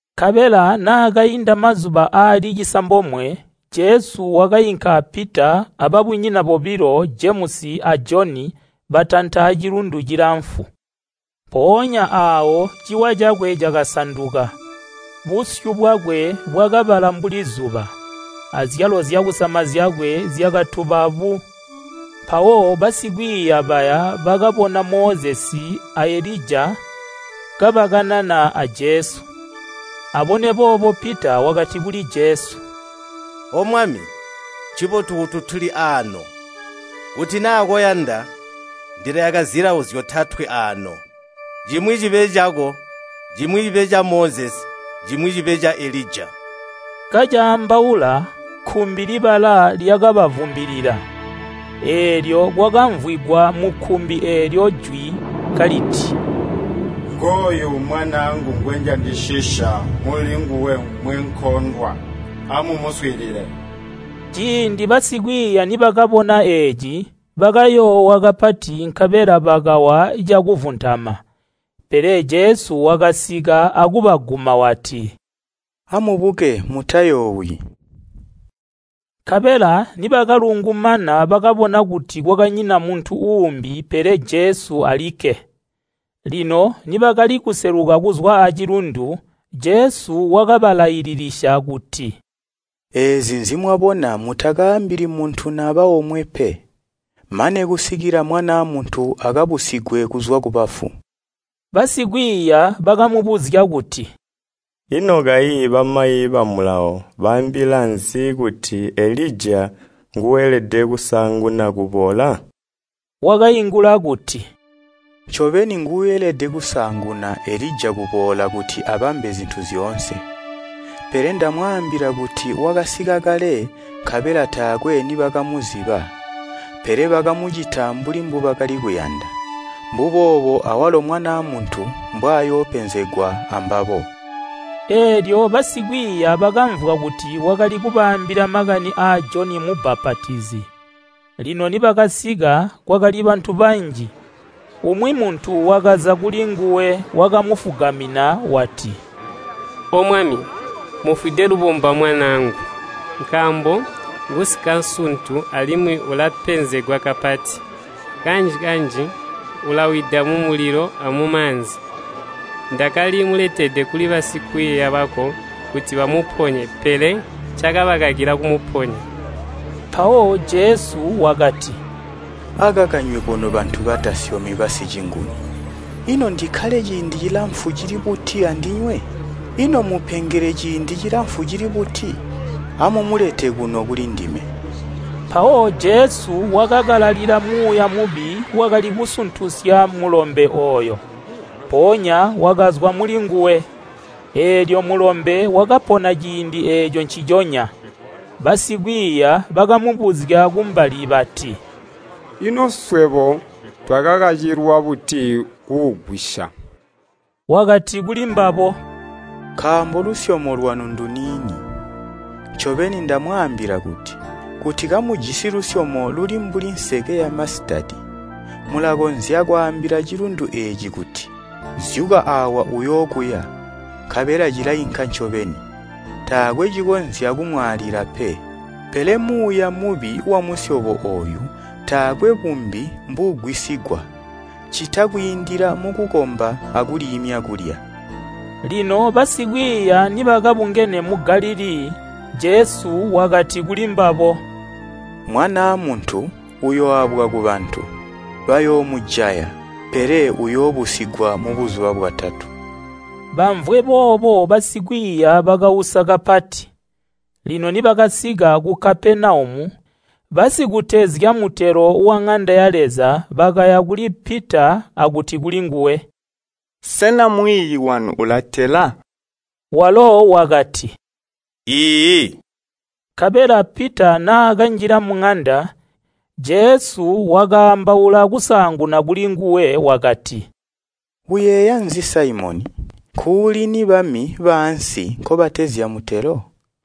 Nkabela naakainda mazuba aali cisambomwe Jesu wakainka a Pita a babunyina bobilo Jemusi a Joni batanta cilundu cilamfu. Mpoonya aawo ciwa cakwe cakasanduka. Busyu bwakwe bwakabala mbuli zuba, azyalo zyakusama zyakwe zyakatuba bu. Mpawo basikwiiya baya bakabona Mozesi a Elija kabakanana a Jesu. Abone boobo Pita wakati kuli Jesu, “O Mwami, ncibotu kuti tuli aano! Kuti naa koyanda, ndilayaka zilawo zyotatwe aano. Cimwi cibe cako, cimwi cibe ca Mozesi, cimwi cibe ca Elija.” Kacaambaula kkumbi libala lyakabavumbilila, eelyo kwakamvwigwa mukkumbi eelyo jwi kaliti, “Ngooyu Mwanaangu ngweyandisisya mulinguwe mwenkondwa. Amumuswiilile!” Ciindi basikwiiya nibakabona eeci, bakayoowa kapati nkabela bakawa cakuvuntama. Pele Jesu wakasika akubaguma wati, “Amubuke mutayoowi.” Nkabela nibakalungumana bakabona kuti kwakanyina muntu uumbi pele Jesu alikke. Lino nibakali kuseluka kuzwa acilundu, Jesu wakabalaililisya kuti, “Eezi nzimwabona mutakaambili muntu naba omwe pe, mane kusikila Mwanaa Muntu akabusigwe kuzwa kubafu.” Basikwiiya bakamubuzya kuti, “Ino kayi bamayi ba Mulawo baambila nzi kuti Elija nguuelede kusaanguna kuboola?” Wakaingula kuti, “Ncobeni nguuelede kusaanguna Elija kuboola kuti abambe zintu zyoonse. Pele ndamwaambila kuti wakasika kale nkabela taakwe nibakamuziba, pele bakamucita mbuli mbubakali kuyanda. Mbuboobo awalo Mwanaa Muntu mbwayoopenzegwa ambabo.” Eelyo basikwiiya bakamvwa kuti wakali kubaambila makani a Joni Mubbapatizi. Lino nibakasika kwakali bantu banji, umwi muntu wakaza kulinguwe wakamufugamina wati, “O Mwami, mufwide lubomba mwanaangu, nkaambo ngusikasuntu alimwi ulapenzegwa kapati. Kanji-kanji ulawida mumulilo, amumaanzi. Ndakali muletede kuli basikwiiya bako kuti bamuponye pele cakabakakila kumuponya.” Mpawo Jesu wakati, “Akaka nywebo nobantu batasyomi basicinguni, ino ndikkale ciindi cilamfu cili buti andinywe? Ino mmupengele ciindi cilamfu cili buti? Amumulete kuno kulindime.” Mpawo Jesu wakakalalila muuya mubi wakali kusuntusya mulombe ooyo, mpoonya wakazwa mulinguwe. Eelyo mulombe wakapona ciindi eeco nciconya. Basikwiiya bakamubuzya kumbali bati, “Ino swebo twakakacilwa buti kuugwisya?” Wakati kulimbabo, “Nkaambo lusyomo lwanu nduniini. Ncobeni ndamwaambila kuti, kuti kamujisi lusyomo luli mbuli nseke yamasitadi, mulakonzya kwaambila cilundu eeci kuti, ‘Zyuka aawa uyookuya,’ nkabela cilainka ncobeni. Taakwe cikonzya kumwaalila pe. Pele muuya mubi wamusyobo ooyu taakwe bumbi mbuugwisigwa, ccita kwiindila mukukomba akuliimya kulya.” Lino basikwiiya nibakabungene mu Galilii, Jesu wakati kulimbabo, “Mwanaa Muntu uyooabwa kubantu. Bayoomujaya. Pele uyoobusigwa mubuzuba bwatatu.” Bamvwe boobo basikwiiya bakausa kapati. Lino nibakasika ku Kapenaumu, basikutezya mutelo waŋanda ya Leza bakaya kuli Pita akuti kulinguwe, “Sena mwiiyi wanu ulatela?” Walo wakati, “Iiyi.” Nkabela Pita naakanjila muŋanda, Jesu wakaambaula kusaanguna kulinguwe wakati, “Uyeeya nzi Saimoni? Nkuulini bami baansi nkobatezya mutelo?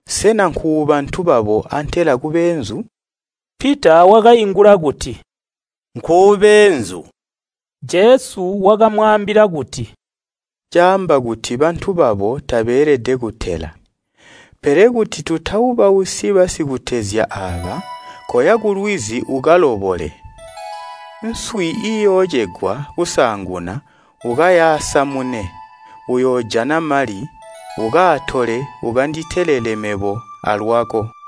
Sena nkuubantu babo antela kubeenzu?” Pita wakaingula kuti, “Nkuubeenzu!” Jesu wakamwaambila kuti, “Caamba kuti bantu babo tabeelede kutela.” Pele kuti tutaubausyi basikutezya aaba koya kulwizi ukalobole. Nswi iiyoocegwa kusaanguna ukayaasamune, uyoojana mali, ukaatole ukanditelele mebo alwako.